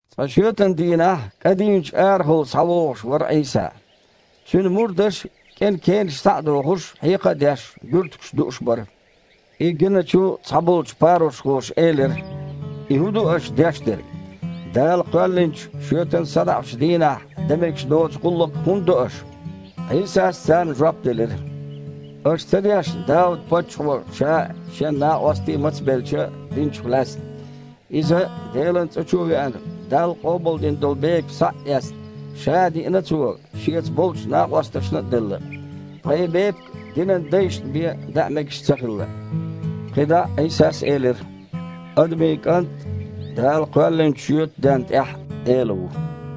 Цкъа шоьтан дийнахь кІа дийначу арахула схьавогІуш вара Іийса. Цуьнан мурдаш, кІен кенаш схьа а дохуш, хьекха а деш, буьртигаш дууш бара. И гиначу цхьаболчу парушхоша элира: «И хІун ду аш деш дерг? Дала кхоьллинчу шоьтан садоІучу дийнахь дан мегаш доцу гІуллакх хІунда до аша?» Іийсас царна жоп делира: «Аша ца дешна Дауд-паччахьо ша а, шен накъостий а мацбелча, динчух лаьцна? Иза Делан цІа чу а веана, Далла къобалдина долу бепиг схьа а эцна, ша а диина цо, шеца болчу накъосташна а делла. Ткъа и бепиг динан дайшна бен даа мегаш ца хилла». КхидІа а Іийсас элира: «Адамийн КІант Дала кхоьллинчу шоьтан денна тІехь а Эла ву».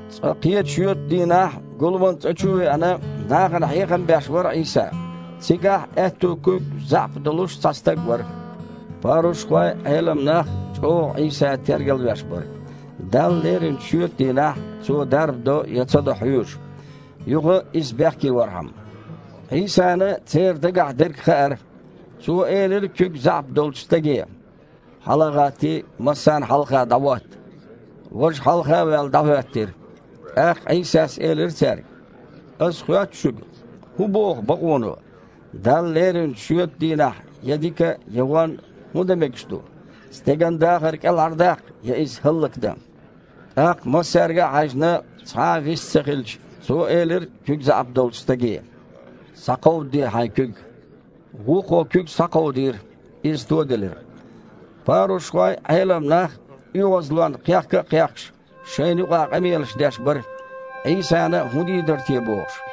Цкъа кхечу шоьтан дийнахь, гуламан цІа чу а веана, нахана хьехам беш вара Іийса. Цигахь аьтту куьг заьІап долуш цхьа стаг вара. Парушхой а, Іелам нах а чІогІа Іийса тергалвеш бара, Далла леринчу шоьтан дийнахь Цо дарба до я ца до хьоьжуш, юха Иза бехке вархьама. Іийсана церан дагахь дерг хаьара. Цо элира куьг заьІап долчу стаге: «Хьала а гІаттий, массарна хьалха дІахІотта». Важа, хьалха а ваьлла, дІахІоьттира. ТІаккха Іийсас элира цаьрга: «Ас хоьтту шуьга: хІун боху бакъоно, Далла леринчу шоьтан дийнахь я дика, я вон хІун дан мегаш ду? Стеган дахар кІелхьардаккха я иза хІаллакдан?» ТІаккха массаьрга а хьаьжна, цхьа а вист ца хилча, Цо элира куьг заьІап долчу стаге: «Схьакховдаде хьайн куьг!» Вукхо куьг схьакховдийра – иза тоделира. Парушхой а, Іелам нах а, оьгІазлонна кхехка а кхехкаш, шайна юкъахь къамелаш деш бара, Іийсана хІун дийр дара бохуш.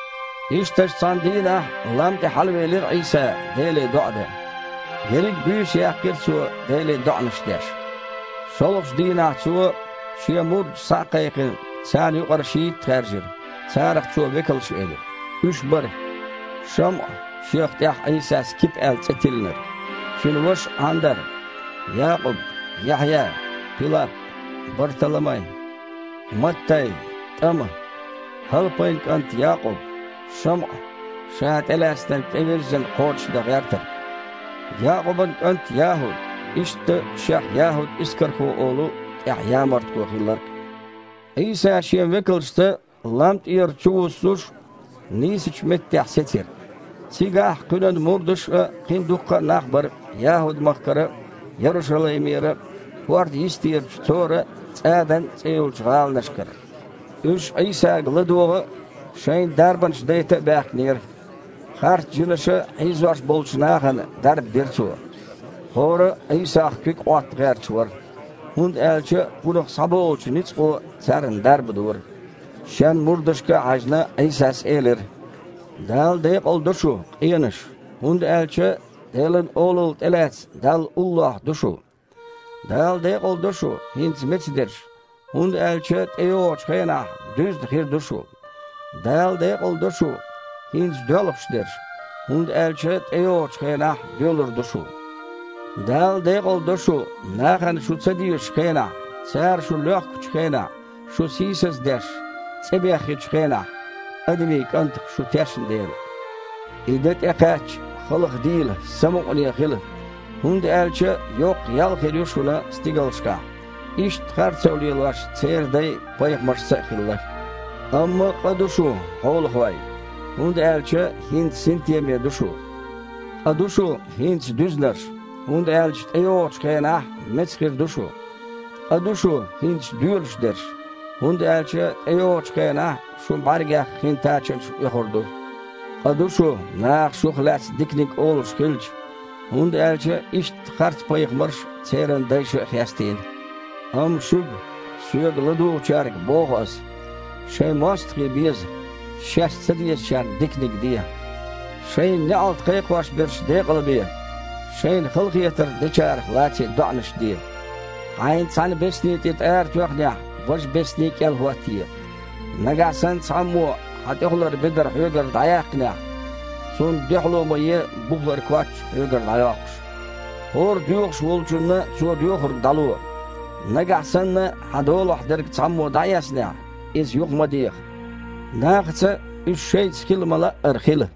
Ишттачу цхьана дийнахь лам тІе хьалавелира Іийса Деле доІа дан. Ерриг буьйса яьккхира Цо Деле доІанаш деш. ШолгІачу дийнахь Цо, Шен мурдаш схьа а кхайкхина, царна юкъара шийтта хаьржира. Царах Цо векалш элира. Уьш бара: ШамІа, шех тІаьхьа Іийсас Кипа аьлла цІе тиллинарг, цуьнан ваша Іандар, Якъуб, Яхьъя, Пилап, Барталамай, Маттай, ТІама, ХІалпайн кІант Якъуб, ШамІа, ша тІелаьцнарг тІевирззина кхочушдан гІертарг, Якъубан кІант ЯхІуд, иштта шех ЯхІуд-Искархо олу, тІаьхьа ямартхо хилларг а. Іийса Шен векалшца, лам тІера чувуссуш, нийсачу меттехь сецира. Цигахь Кхуьнан мурдаш а, кхин дуккха а нах бара ЯхІуд-махкара а, Ярушалаймера а, хІордан йистерачу Цора а, ЦІадан а цІе йолчу гІаланашкара. Уьш Іийсага ладогІа а, шайна дарбанаш дайта а баьхкинера. Харцжинаша хьийзош болчу нахана дарба дира Цо. ХІора а Іийсах куьг Іотта гІерташ вара, хІунда аьлча Кхунах схьаболучу ницкъо царна дарба дора. Шен мурдашка а хьаьжна, Іийсас элира: «Дала декъала до шу, къенаш, хІунда аьлча Делан Олалла тІе а лаьцна, Далла уллохь ду шу. Дала декъала до шу, хІинца меца дерш, хІунда аьлча тІейогІучу хенахь дуьзна хир ду шу. Дала декъала до шу, хІинца доьлхуш дерш, хІунда аьлча тІейогІучу хенахь доьлур ду шу. Дала декъала до шу, нахана шу ца дезачу хенахь, цара шу лоьхкучу хенахь, шу сийсаздеш, цІе бехъечу хенахь, Адамийн КІантах шу тешна дела. И де тІекхаьчча, халхадийла, самукъане хила, хІунда аьлча йоккха ял хир ю шуна стигалшкахь. Иштта харцо лелош церан дай пайхамаршца а хилла. Амма къа ду шун, хьолахой, хІунда аьлча хІинца синтеме ду шу. Къа ду шун, хІинца дуьзнарш, хІунда аьлча тІейогІучу хенахь меца хир ду шу. Къа ду шун, хІинца доьлуш дерш, хІунда аьлча тІейогІучу хенахь шун бІаьргех хин тачанаш оьхур ду. Къа ду шун наха шух лаьцна диканиг олуш хилча, хІунда аьлча иштта харцпайхамарш церан дайша а хестийна». «Амма шуьга, Соьга ладугІучаьрга, боху Ас: Шайн мостагІий беза, шаьш ца дезачарна диканиг де, шайна неІалт кхайкхош берш декъалбе, шайна халахетар дечарах лаций доІанаш де. Хьайна цхьана бесни тІе тІара тоьхнехь, важа бесни кІел хІоттае. Нагахь санна цхьаммо хьан тІехулара бедар хьоьгара дІаяьккхинехь, цунна дуьхьало ма е бухалара коч хьоьгара дІайоккхуш. ХІора доьхуш волчунна цо доьхург дІало. Нагахь санна хьан долахь дерг цхьаммо дІаэцнехь, иза юха ма деха. Нахаца, уьш шайца хила ма-лаъара, хила.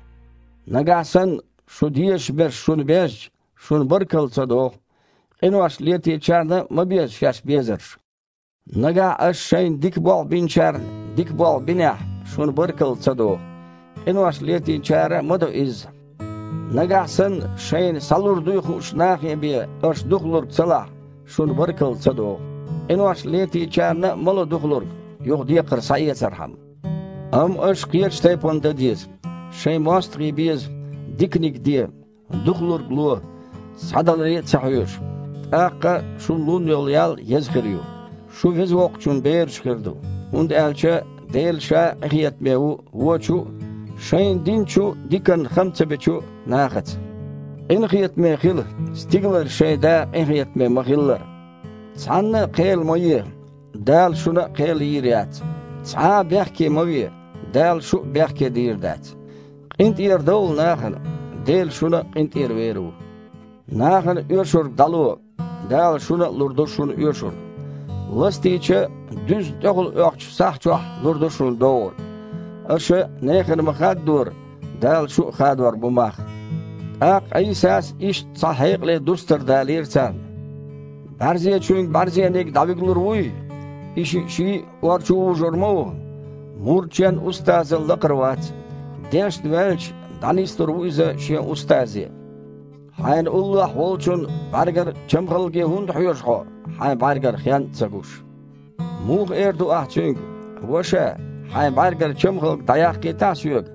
Нагахь санна шу дезаш берш шуна безча, шуна баркалла ца догІу. Къинош летийначарна а ма беза шаьш безарш. Нагахь аш шайна дика болх биначарна дика болх бинехь, шуна баркалла ца догІу. Къинош летийначара а ма до изза. Нагахь санна шайна схьалур дуй хуучу нахе бен аш духалург ца лахь, шуна баркалла ца догІу. Къинош летийначара а ма ло духалург, юха декхар схьаэцархьама. Амма аш кхечу тайпана дан деза: шайн мостагІий беза, диканиг де, духалург ло, схьадаларе а ца хьоьжуш, тІаккха шуна лун йолу ял еза хир ю: шу Веза Воккхачун бераш хир ду, хІунда аьлча Дела Ша а къинхетаме ву вочу а, шайна динчу диканна хама ца бечу а нахаца. Къинхетаме хила, стигалара шайн Да къинхетаме ма-хиллара». «Цхьанна а кхел ма е, Дала шуна а кхел йийр яц. Цхьа а бехке ма ве, Дала шу а бехке дийр дац. КъинтІерадовла нахана, Дела шуна а къинтІера вер ву. Нахана оьшург дІало, Дала шуна а лур ду шуна оьшург. Ластийча, дуьзна тІехула оьхучу сахь чохь лур ду шуна догІург. Аша нехан ма-хаддора, Дала шун а хадор бу мах». ТІаккха Іийсас иштта цхьа хьекъале дустар далийра царна: «БІаьрзечуьнга бІаьрзениг дІавигалур вуй? И шиъ ший а ор чу вужур ма ву. Мурд шен устазал лакхара вац. Дешна ваьлча, дІанислур ву иза шен устазе. Хьайна уллохь волчун бІаьргара чамхалге хІунда хьоьжу хьо, хьайн бІаьргара хен а ца гуш? Муха эр ду ахь цуьнга: „Ваша, хьайн бІаьргара чамхалг дІаяккхийтахьа соьга“,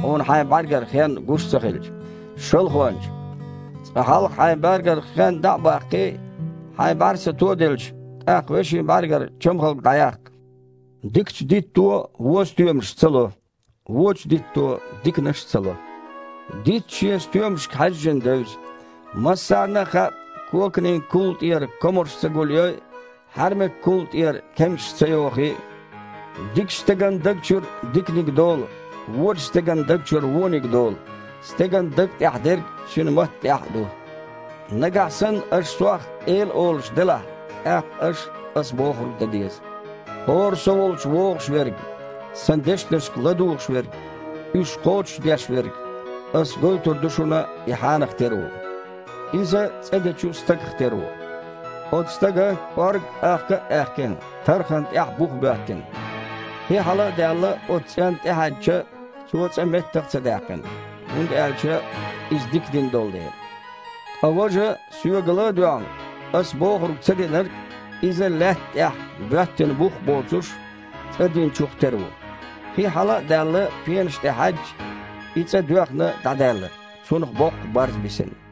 хьуна хьайн бІаьргара хен гуш ца хилча? Шалхонча! Цкъа хьалха хьайн бІаьргара хен дІа а баккхий, хьайн бІаьрса тоделча, тІаккха вешин бІаьргара чамхалг дІаяккха». «Дикачу дитто вон стоьмаш ца ло, вочу дитто диканаш ца ло Дитт шен стоьмашка хьаьжжина девза. Массарна а хаьа, коканийн кулла тІера комарш ца гулйой а, хьаьрмак кулла тІера кемсаш ца йохий а. Дикачу стеган даг чуьра диканиг долу, вочу стеган даг чуьра вониг долу. Стеган даг тІехь дерг цуьнан матта тІехь а ду». «Нагахь санна аш Сох „Эла“ олуш делахь, тІаккха аш Ас бохург дан деза. ХІора Со волчу вогІуш верг, Сан дешнашка ладугІуш верг, уьш кхочушдеш верг – Ас гойтур ду шуна, и хьанах тера ву. Иза цІа дечу стагах тера ву. Оцу стага, кІоргга ахка а аьхкина, тархана тІехь бух боьттина. Хи, хьала а даьлла, оцу цІенна тІе хьаьдча, цо цІа меттах а ца даьккхина, хІунда аьлча иза дика дина долу дела. Ткъа важа, Соьга ла а доьгІна, Ас бохург ца динарг – иза лаьтта тІехь, боьттина бух а боцуш, цІа динчух тера ву. Хи, хьала а даьлла, пенаш тІе хьаьдча, и цІа доьхна дІадаьлла, цунах боккха барз бисина».